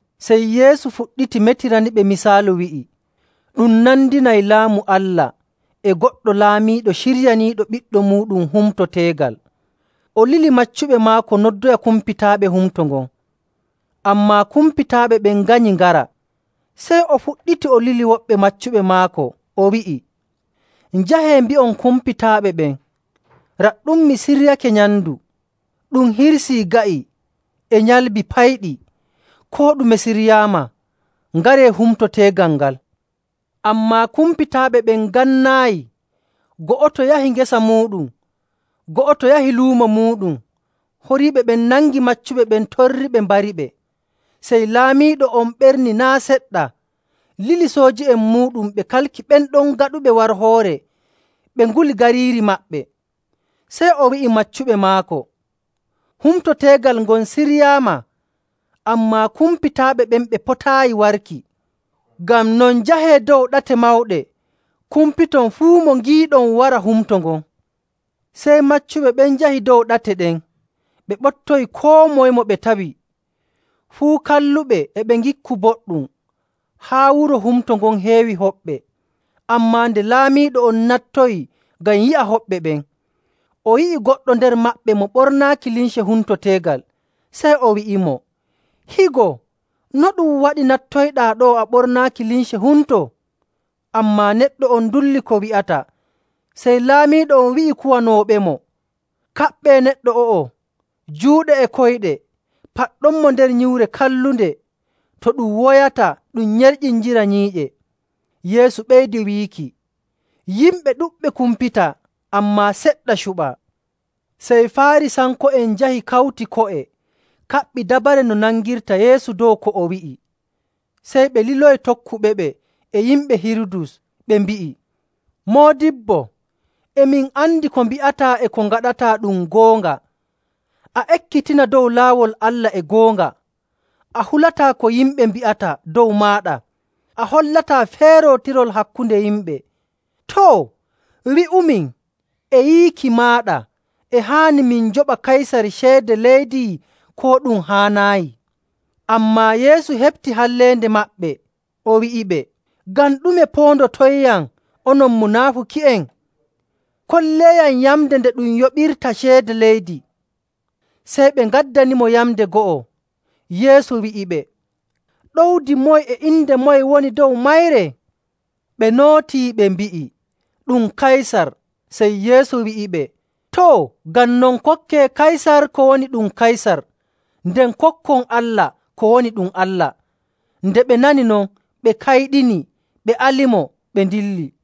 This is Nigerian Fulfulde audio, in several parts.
Sey Yeesu fuɗɗiti metiraniɓe misaalu, wi'i, “Ɗum nandinay Laamu Allah e goɗɗo laamiiɗo ciryaniiɗo ɓiɗɗo muuɗum humto teegal. O lili maccuɓe maako noddoya kumpitaaɓe humto ngon, ammaa kumpitaaɓe ɓen nganyi ngara. Sey o fuɗɗiti o lili woɓɓe maccuɓe maako, o wi'i, ‘Njahee mbi'on kumpitaaɓe ɓen, “Raɗɗum mi siryake nyamndu, ɗum hirsii ga'i e nyalbi payɗi, koo ɗume siryaama. Ngaree humto teegal ngal!” ’ Ammaa kumpitaaɓe ɓen ngannaayi. Go'oto yahi ngesa muuɗum, go'oto yahi luumo muuɗum. Horiiɓe ɓen nangi maccuɓe ɓen torriɓe, mbariɓe. Sey laamiiɗo on ɓerni naa' seɗɗa, lili sooji'en muuɗum ɓe kalki ɓen ɗon gaɗuɓe warhoore ɓe nguli gariiri maɓɓe. Sey o wi'i maccuɓe maako, ‘Humto teegal ngon siryaama, ammaa kumpitaaɓe ɓen ɓe potaayi warki. Ngam non njahee dow ɗate mawɗe, kumpiton fuu mo ngiiɗon wara humto ngon.’ Sey maccuɓe ɓen njahi dow ɗate ɗen ɓe ɓoptoyi koo moye mo ɓe tawi, fuu kalluɓe e ɓe ngikku boɗɗum, haa wuro humto ngon heewi hoɓɓe. “Ammaa nde laamiiɗo on nattoyi ngam yi'a hoɓɓe ɓen, o yi'i goɗɗo nder maɓɓe mo ɓornaaki limce humto teegal. Sey o wi'imo, ‘Higo, no ɗum waɗi nattoyɗaa ɗo'o a ɓornaaki limce humto?’ Ammaa neɗɗo on dulli ko wi'ata. Sey laamiiɗo on wi'i kuwanooɓemo, ‘Kaɓɓee neɗɗo o'o juuɗe e koyɗe, paɗɗonmo nder nyiwre kallunde, to ɗum woyata ɗum nyerƴindira nyiiƴe.’”. Yeesu ɓeydi wiiki, “Yimɓe ɗuɗɓe kumpitaa, ammaa seɗɗa cuɓaa.” Sey Faarisanko'en njahi kawti ko'e, kaɓɓi dabare no ɓe nangirta Yeesu dow ko o wi'i. Sey ɓe liloyi tokkuɓeɓe e yimɓe Hirudus, ɓe mbi'i, “Moodibbo, e min andi ko mbi'ataa e ko ngaɗataa ɗum goonga, a ekkitina dow laawol Allah e goonga, a hulataa ko yimɓe mbi'ata dow maaɗa, a hollataa feerootirol hakkunde yimɓe. Too, wi'umin, e yiiki maaɗa e haani min njoɓa Kaysar ceede leydi koo ɗum haanaayi?” Ammaa Yeesu heɓti halleende maɓɓe, o wi'iɓe, “Ngam ɗume poondotonyam, onon munaafuki'en? Kolleeyam yamnde nde ɗum yoɓirta ceede leydi.” Sey ɓe ngaddanimo yamnde go'o. Yeesu wi'iɓe, “Ɗowdi moye e inde moye woni dow mayre?” Ɓe nootii, ɓe mbi'i, “Ɗum Kaysar.” Sey Yeesu wi'iɓe, “Too, ngam non kokkee Kaysar ko woni ɗum Kaysar, nden kokkon Allah ko woni ɗum Allah.” Nde ɓe nani non, ɓe kayɗini, ɓe alimo, ɓe ndilli.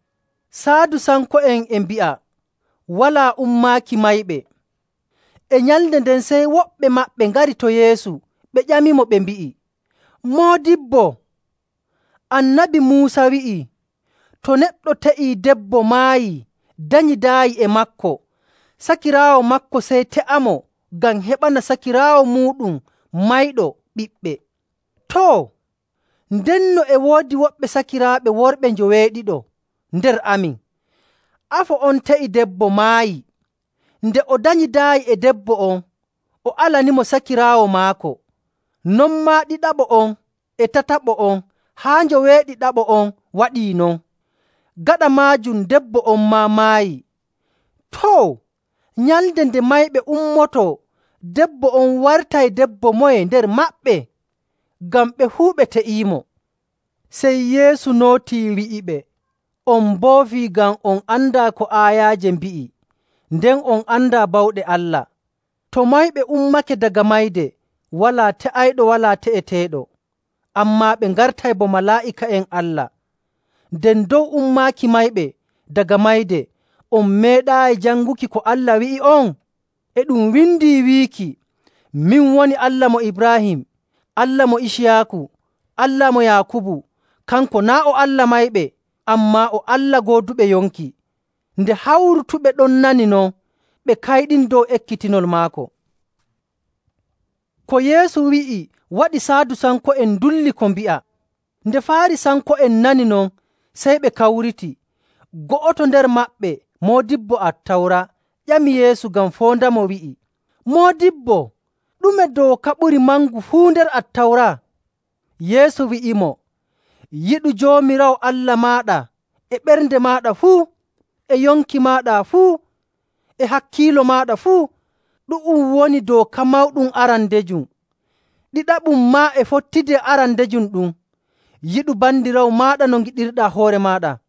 Saadusanko'en e mbi'a walaa ummaaki mayɓe. E nyalnde nden, sey woɓɓe maɓɓe ngari to Yeesu, ɓe ƴamimo, ɓe mbi'i,. “Moodibbo, Annabi Muusa wi'ii to neɗɗo te'ii debbo maayii danyidaayi e maako, sakiraawo maako sey te'amo ngam heɓana sakiraawo muuɗum mayɗo ɓiɓɓe.. Too, ndenno e woodi woɓɓe sakiraaɓe worɓe njoweeɗiɗo nder amin. Afo on te'i debbo, maayi. Nde o danyidaayi e debbo on, o alanimo sakiraawo maako. Non maa ɗiɗaɓo on e tataɓo on haa njoweeɗiɗaɓo on waɗii non. Gaɗa maajum debbo on maa maayi. Too, nyalnde nde mayɓe ummotoo debbo on wartay debbo moye nder maɓɓe? Ngam ɓe fuu ɓe te'iimo.” Sey Yeesu nootii, wi'iɓe, “On mboofii ngam on andaa ko aayaaje mbi'i, nden on andaa bawɗe Allah. To mayɓe ummake daga mayde, walaa te'ayɗo walaa te'eteeɗo, ammaa ɓe ngartay bo malaa'ika'en Allah. Nden dow ummaaki mayɓe daga mayde, on meeɗaayi janguki ko Allah wi'i'on? E ɗum windi wiiki, ‘Min woni Allah mo Ibraahim, Allah mo Iciyaaku, Allah mo Yaakubu.’ Kanko naa' o Allah mayɓe, ammaa o Allah gooduɓe yonki.”. Nde hawrutuɓe ɗon nani non, ɓe kayɗini dow ekkitinol maako. Ko Yeesu wi'i waɗi Saadusanko'en ndullii ko mbi'a. Nde Faarisanko'en nani non, sey ɓe kawriti. Go'oto nder maɓɓe, moodibbo Attawra, ƴami Yeesu ngam foondamo, wi'i, “Moodibbo, ɗume dooka ɓuri mangu fuu nder Attawra?” Yeesu wi'imo, “ ‘Yiɗu Joomiraawo Allah maaɗa e ɓernde maaɗa fuu, e yonki maaɗa fuu, e hakkiilo maaɗa fuu.’. Ɗu'um woni dooka mawɗum arandejum. Ɗiɗaɓum maa e fottidi e arandejum ɗum. ‘Yiɗu bandiraawo maaɗa no ngiɗirɗaa hoore maaɗa.’.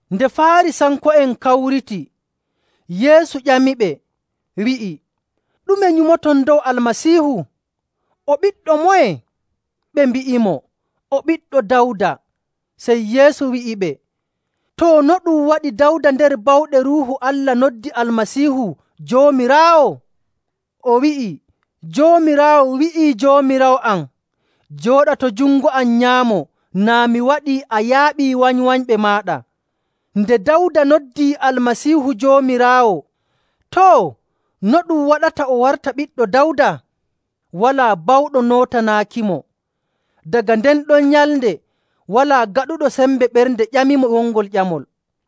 Nde Faarisanko'en kawriti, Yeesu ƴamiɓe, wi'i, “Ɗume nyumoton dow Almasiihu? O ɓiɗɗo moye?” Ɓe mbi'imo, “O ɓiɗɗo Dawda.” Sey Yeesu wi'iɓe, “Too, no ɗum waɗi Dawda nder bawɗe Ruuhu Allah noddi Almasiihu ‘Joomiraawo?’ O wi'i, ‘Joomiraawo wi'ii Joomiraawo am, “Jooɗa to jungo am nyaamo, naa mi waɗii a yaaɓii wanywanyɓe maaɗa.”’. Nde Dawda noddii Almasiihu ‘Joomiraawo,’ too, no ɗum waɗata o warta ɓiɗɗo Dawda?” Walaa bawɗo nootanaakimo. Daga nden ɗon nyalnde walaa gaɗuɗo sembe ɓernde ƴamimo wongol ƴamol.